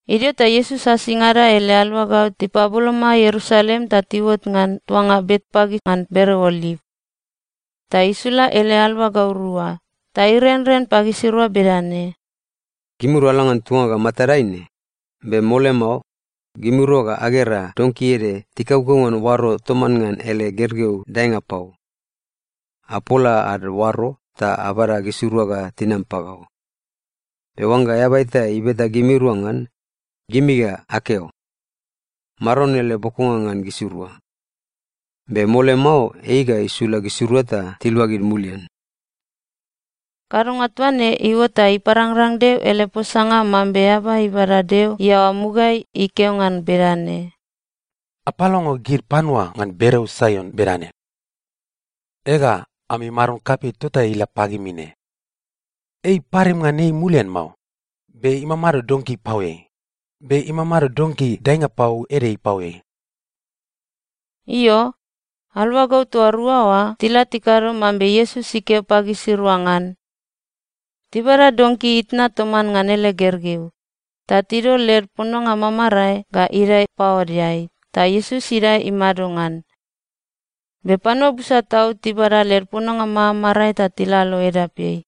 Idio ta Iesus asingada ele aluagau tipaboloma Ierusalem ta tiuot ngan tuanga Betpage ngan bereo Oliv. Ta isula ele aluagau rua ta irenren pagisirua bedane, “Gimirua ala ngan tuanga ga matadai ne, be mole mao, gimirua ga agera donki ede tikaukau ngan oaro toman ngan ele gergeu daenga pau. Apola ad oaro ta abada gisirua ga tinam pagau. Be oangga eaba eta ibeta gimirua ngan, gimi ga akeo, ‘Maron ele bokonga ngan gisirua. Be mole mao ei ga isula gisirua ta tiluagid mulian.’” Kadonga toa ne iuot ta iparangrang Deo ele posanga mambe eaba ibada Deo iaoa mugaeai ikeo ngan bedane, “Apalongo gid panua ngan bereo Saion bedane, ‘Ega, ami Maron kapei tota ila pagimi ne. Ei iparim ngan ei mulian mao, be imamado donki ipaoeai, be imamado donki daenga pau ede ipaoeai.’” Io, aluagau toa rua oa tila tikado mambe Iesus ikeo pagisirua ngan. Tibada donki itna toman ngan ele gergeu, ta tidol led pononga mamarae ga idae paodeai ta Iesus idae imado ngan. Be panua busa tau tibada led pononga mamarae ta tilalo edapeai.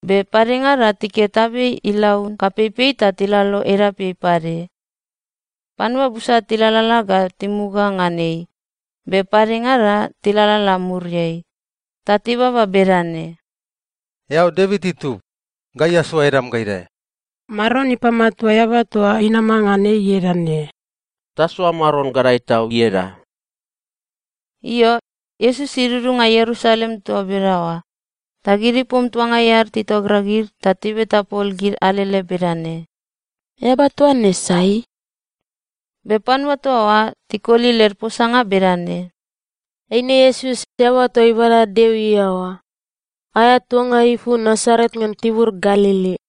Be padengada tiket abei ilaun kapeipei ta tilalo edapeai pade. Panua busa tilalala ga timuga ngan ei, be padengada tilalala muriai, ta tibaba bedane, “Eao Devit itub, gai asoa edam ga idae!” “Maron ipamatua eaba toa inama ngan ei ieda ne!” “Tasoa Maron gadae tau ieda!” Io, Iesus idudunga Ierusalem toa bedaoa, ta gid ipom tuangai ad titogragid ta tibeta pol gid alele bedane, “Eaba toa ne sai?” Be panua toa oa, tikoli led posanga bedane, “Eine Iesus, eaba toa ibada Deo iaoa. Aea tuanga ipu Nasaret ngan tibur Galili.”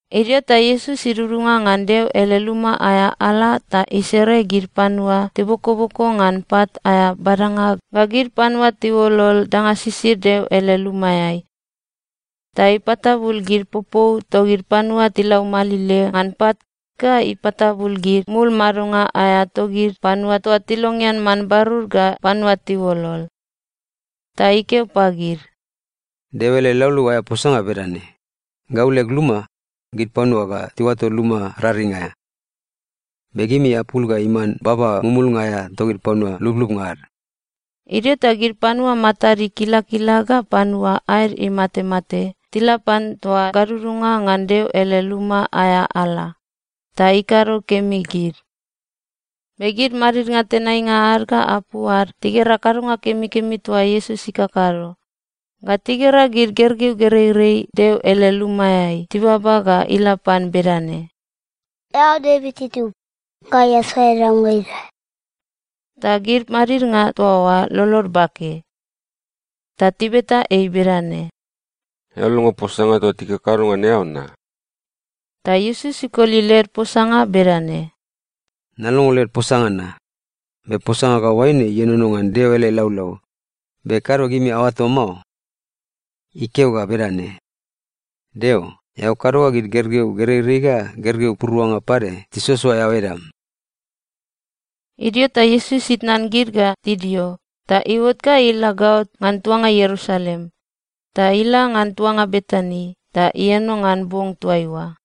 Idio ta Iesus idudunga ngan Deo ele luma aea ala ta isere gid panua tibokoboko ngan pat aea badanga ga gid panua tiuolol danga sisid Deo ele lumaeai. Ta ipatabul gid popou togid panua tilaumalile ngan pat ga ipatabul gid mul madonga aea togid panua toa tilongean man barur ga panua tiuolol. Ta ikeo pagid, “Deo ele laulau aea posanga bedane, ‘Gau leg luma, gid panua ga tiuato luma raring aea.’ Be gimi apul ga iman ‘baba mumulnga aea togid panua lublubnga ad.’” Idio ta gid panua matad ikilakila ga panua aed imatemate tila pan toa gadudunga ngan Deo ele luma aea ala, ta ikado kemi gid. Be gid madidnga tenainga ad ga apu ad tigera kadonga kemikemi toa Iesus ikakado, ga tigera gid gergeu gereirei Deo ele lumaeai tibaba ga ila pan bedane, “Eao Devit itub, gai asoa edam ga idae!” Ta gid madidnga toa oa lolod bake. Ta tibeta ei bedane, “Eao longo posanga toa tikakado ngan eao na?” Ta Iesus ikoli led posanga bedane, “Nalongo led posanga na. Be posanga ga oaine ienono ngan Deo ele laulau, be kado gimi aoato mao? Ikeo ga bedane, “‘Deo, eao kado ga gid gergeu gereirei ga gergeu puruanga pade tisoasoa eao edam.’” Idio ta Iesus itnan gid ga tidio ta iuot ga ila gaot ngan tuanga Ierusalem, ta ila ngan tuanga Betani ta ieno ngan bong toaiua.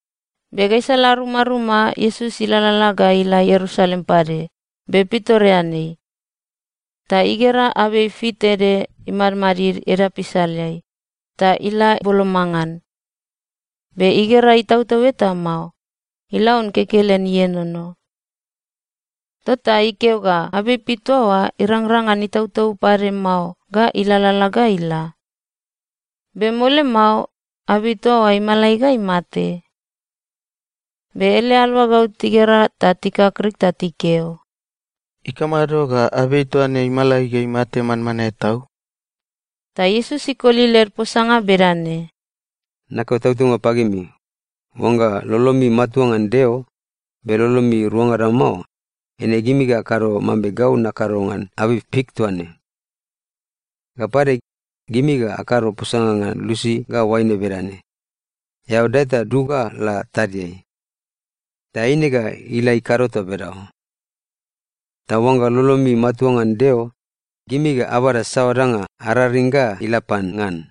Be gaisala rumaruma Iesus ilalala ga ila Ierusalem pade, be pitoreanei. Ta igera abei fik ede imadmadid edap isaleai, ta ila boloma ngan. Be igera itautau eta mao. Ilaun kekelen ienono. Tota ikeo ga abei fik toa oa irangrang ngan itautau pade mao ga ilalala ga ila. Be mole mao, abei toa oa imalai ga imate. Be ele aluagau tigera ta tikakrik ta tikeo, “Ikamado ga abei toa ne imalai ga imate manmanae tau?” Ta Iesus ikoli led posanga bedane, “Nakeo tautaunga pagimi, oangga lolomi matua ngan Deo, be lolomi ruangada mao, eine gimi ga akado mambe gau nakado ngan abei fik toa ne. Ga pade, gimi ga akado posanga ngan lusi ga oaine bedane, ‘Eao dae ta dug ga la tadiai!’ Ta eine ga ila ikado toa bedaoa. Ta oangga lolomi matua ngan Deo, gimi ga abada saoa danga araring ga ila pan ngan.”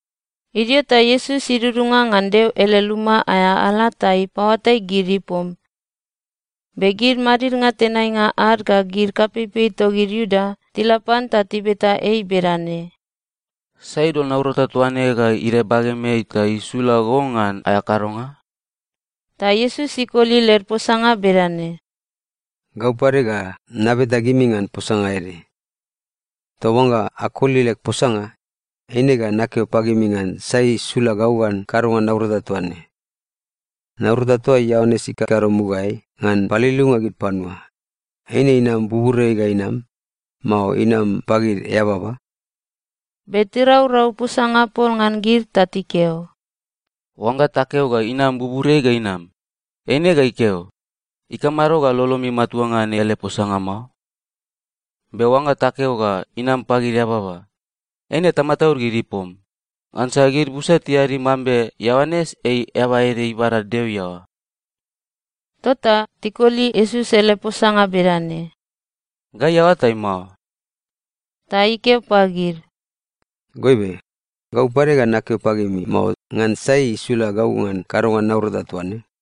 Idio ta Iesus idudunga ngan Deo ele luma aea ala ta ipaoatai gid ipom. Be gid madidnga tenainga ad ga gid kapeipei togid Iuda tila pan ta tibeta ei bedane, “Sai idol naurata toa ne ga idae bagemeai ta isula go ngan aea kadonga?” Ta Iesus ikoli led posanga bedane, “Gau pade ga nabeta gimi ngan posanga ede. Ta oangga akoli leg posanga, eine ga nakeo pagimi ngan sai isula gau ngan kadonga naurata toa ne. Naurata toa Ioanes ikakado mugaeai, ngan paliliunga gid panua, eine inam buburiai ga inam, mao inam pagid eababa?” Be tiraurau posanga pol ngan gid ta tikeo, “Oangga takeo ga inam buburiai ga inam, eine ga ikeo, ‘Ikamado ga lolomi matua ngan ele posanga mao?’ Be oangga takeo ga inam pagid eababa, eine tamataud gid ipom. Ngansa gid busa tiadi mambe Ioanes ei eaba ede ibada Deo iaoa.” Tota tikoli Iesus ele posanga bedane, “Gai aoatai mao.” Ta ikeo pagid, “Goibe, gau pade ga nakeo pagimi mao ngan sai isula gau ngan kadonga naurata toa ne.”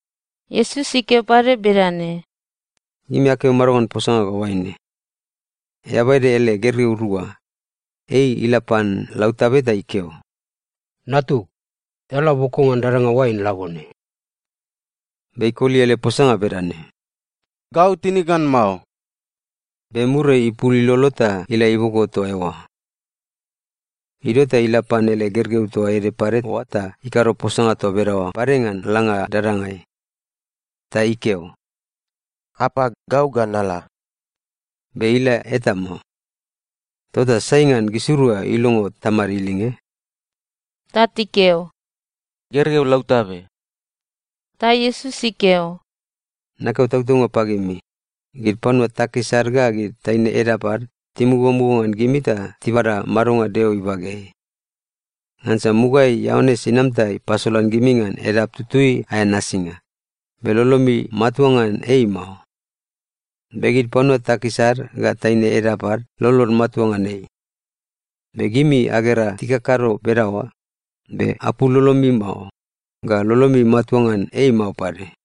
Iesus ikeo pade bedane, “Gimi akeo mado ngan posanga ga oaine? Eaba ede ele gergeu rua. Ei ila pan lautabe ta ikeo, ‘Natug, eao la boko ngan dadanga oain labone.’ “Be ikoli ele posanga bedane, ‘Gau tinig ngan mao.’ Be muriai, ipul ilolo ta ila iboko toa eoa. “Idio ta ila pan ele gergeu toa ede pade oa ta ikado posanga toa bedaoa pade ngan langa dadangai. Ta ikeo, ‘Apa, gau ga nala.’ Be ila eta mao. “Tota sai ngan gisirua ilongo tamad ilinge?” Ta tikeo, “Gergeu lautabe.” Ta Iesus ikeo, “Nakeo tautaunga pagimi, gid panua takis ad ga gid taine edap ad timugamuga ngan gimi ta tibada madonga Deo ibageai. Ngansa mugaeai Ioanes inam ta ipasolan gimi ngan edap tutui aea nasinga, be lolomi matua ngan ei mao. Be gid panua takis ad ga taine edap ad lolod matua ngan ei. Be gimi agera tikakado bedaoa, be apul lolomi mao, ga lolomi matua ngan ei mao pade.”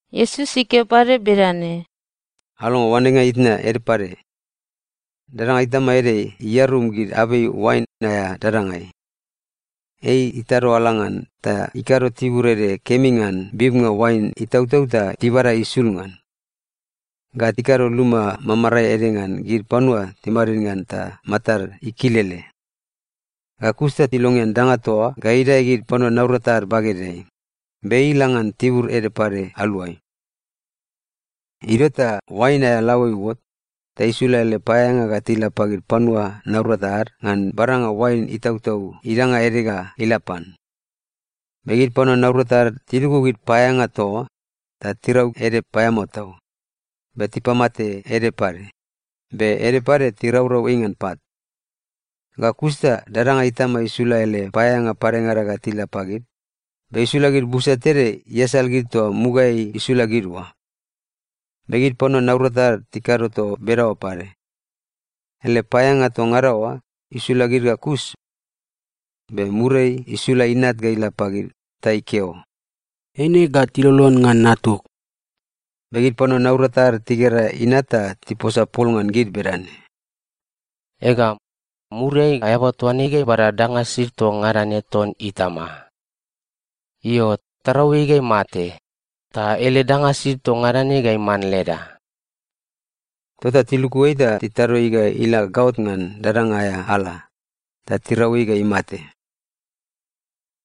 Iesus ikeo pade bedane, “Alongo oanenga itna ede pade. Dadanga itama ede iarum gid abei oain aea dadangai. Ei itado ala ngan ta ikado tibur ede kemi ngan bibnga oain itautau ta tibada isul ngan. Ga ikado luma mamarae ede ngan gid panua timadid ngan ta matad ikilele. Ga kus ta ilongean dadanga toa oa ga idae gid panua naurata ad bagedeai, be ei ila ngan tibur ede pade aluai. “Idio ta oain aea laoe iuot, ta isula ele paeaeanga ga tila pagid panua naurata ad ngan badanga oain itautau idanga ede ga ila pan. Be gid panua naurata ad tiluku gid paeaeanga toa oa, ta tirau ede paeamao tau, be tipamate ede pade, be ede pade tiraurau ei ngan pat. Ga kus ta dadanga itama isula ele paeaeanga padengada ga tila pagid, be isula gid busa tede iasal gid toa mugaeai isula gid oa. Be gid panua naurata ad tikado toa bedaoa pade. Ele paeaeanga toa ngada oa, isula gid ga kus. Be muriai, isula inat ga ila pagid ta ikeo, ‘Eine ga tilolon ngan natug.’ “Be gid panua naurata ad tigera inat ta tiposa pol ngan gid bedane, ‘Ega, muriai eaba toa ne ga ibada danga sisid toa ngada ne ton itama. Io, tarau ei ga imate, ta ele danga sisid toa ngada ne ga iman leda!’ Tota tiluku ei ta titado ei ga ila gaot ngan dadanga aea ala, ta tirau ei ga imate.”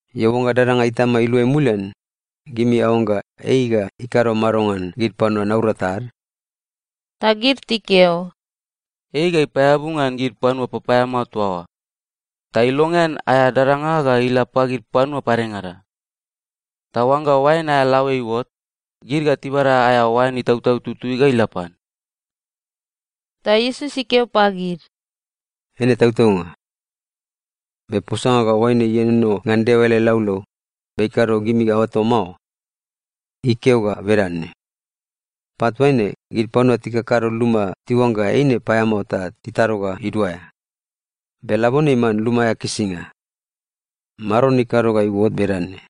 “Io, oangga dadanga itama iluai mulian, gimi aoangga ei ga ikado mado ngan gid panua naurata ad?” Ta gid tikeo, “Ei ga ipaeabu ngan gid panua papaeamao toa oa. Ta ilongean aea dadanga ga ila pagid panua padengada. Ta oangga oain aea laoe iuot, gid ga tibada aea oain itautau tutui ga ila pan.” Ta Iesus ikeo pagid, “Eine tautaunga. Be posanga ga oaine ienono ngan Deo ele laulau, be kado gimi aoato mao? Ikeo ga bedane, “‘Pat toa ne, gid panua tikakado luma tiuangga eine paeamao ta titado ga iduaea. Be labone iman luma aea kisinga. Maron ikado ga iuot bedane,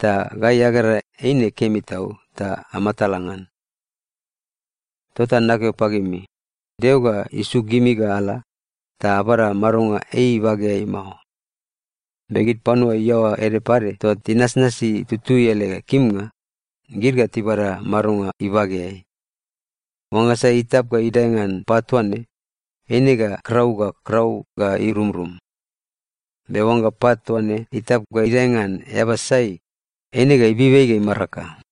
ta gai agera eine kemi tau ta amatala ngan.’ “Tota nakeo pagimi, Deo ga isuk gimi ga ala, ta abada madonga ei ibageai mao. Be gid panua iaoa ede pade toa tinasnasi tutui ele kimnga, gid ga tibada madonga ibageai. Oangga sai itap ga idae ngan pat toa ne, eine ga krau ga krau ga irumrum. Be oangga pat toa ne itap ga idae ngan eaba sai, eine ga ibib ei ga imaraka.”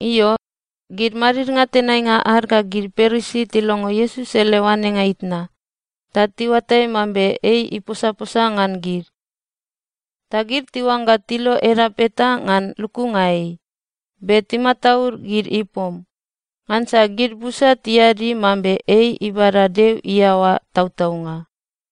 Io, gid madidnga tenainga ad ga gid Parisi tilongo Iesus ele oanenga itna, ta tiuatai mambe ei iposaposa ngan gid. Ta gid tiuangga tilo edap eta ngan lukunga ei, be timataud gid ipom, ngansa gid busa tiadi mambe ei ibada Deo iaoa tautaunga.